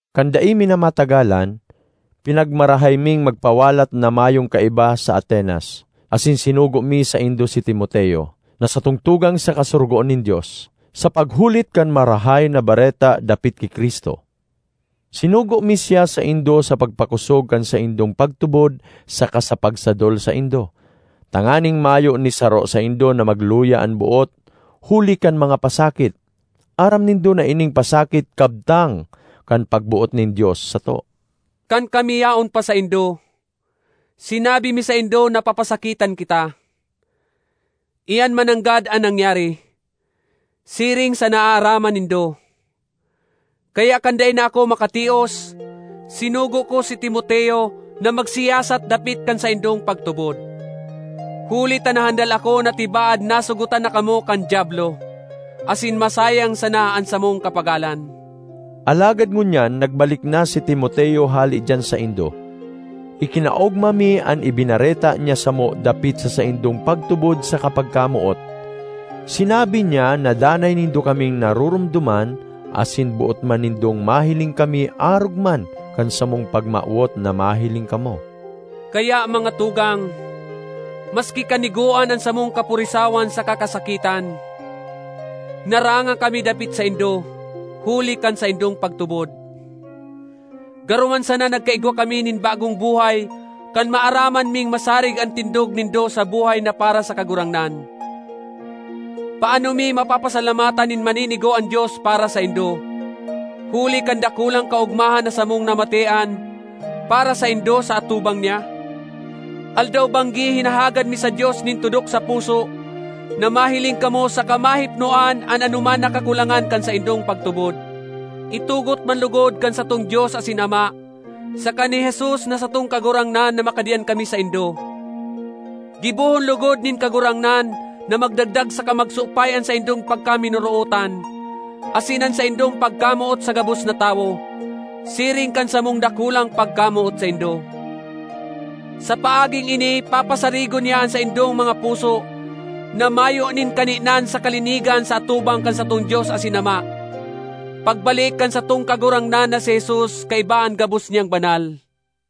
Kan dai mi na matagalan, pinagmarahay ming magpawalat na mayong kaiba sa Atenas, asin sinugo mi saindo si Timoteo, na satong tugang saka sorogoon nin Dios, sa paghulit kan Marahay na Bareta dapit ki Cristo. Sinugo mi siya saindo sa pagpakosog kan saindong pagtubod saka sa pagsadol saindo tanganing mayo ni saro saindo na magluya an boot huli kan mga pasakit. Aram nindo na ining pasakit kabtang kan pagboot nin Dios sato. Kan kami yaon pa saindo, sinabi mi saindo na papasakitan kita; iyan mananggad an nangyari, siring sa naaaraman nindo. Kaya kan dai na ako makatios, sinugo ko si Timoteo na magsiyasat dapit kan saindong pagtubod, huli ta nahandal ako na tibaad nasugotan na kamo kan Diablo, asin masayang sana an samong kapagalan. Alagad ngunyan nagbalik na si Timoteo hale diyan saindo; ikinaogma mi an ibinareta niya samo dapit sa saindong pagtubod saka pagkamoot. Sinabi niya na danay nindo kaming naroromdoman asin boot man nindong mahiling kami arog man kan samong pagmawot na mahiling kamo. Kaya, mga tugang, maski kanigoan an samong kapurisawan saka kasakitan, naranga kami dapit saindo, huli kan saindong pagtubod. Garo man sana nagkaigwa kami nin bagong buhay kan maaraman ming masarig an tindog nindo sa buhay na para sa Kagurangnan. Paano mi mapapasalamatan nin maninigo an Dios para saindo, huli kan dakulang kaogmahan na samong namatean para saindo sa atubang niya? Aldaw-banggi hinahagad mi sa Dios nin tudok sa puso na mahiling kamo saka mahipnoan an anoman na kakulangan kan saindong pagtubod. Itugot man logod kan satong Dios asin Ama saka ni Jesus na satong Kagurangnan na makadiyan kami saindo! Gibohon logod nin Kagurangnan na magdagdag saka magsupay an saindong pagkaminorootan asin an saindong pagkamoot sa gabos na tawo, siring kan samong dakulang pagkamoot saindo. Sa paaging ini papasarigon niya an saindong mga puso na mayo nin kaninan sa kalinigan sa atubang kan satong Dios asin Ama, pagbalik kan satong Kagurangnan na si Jesus kaiba an gabos niyang banal.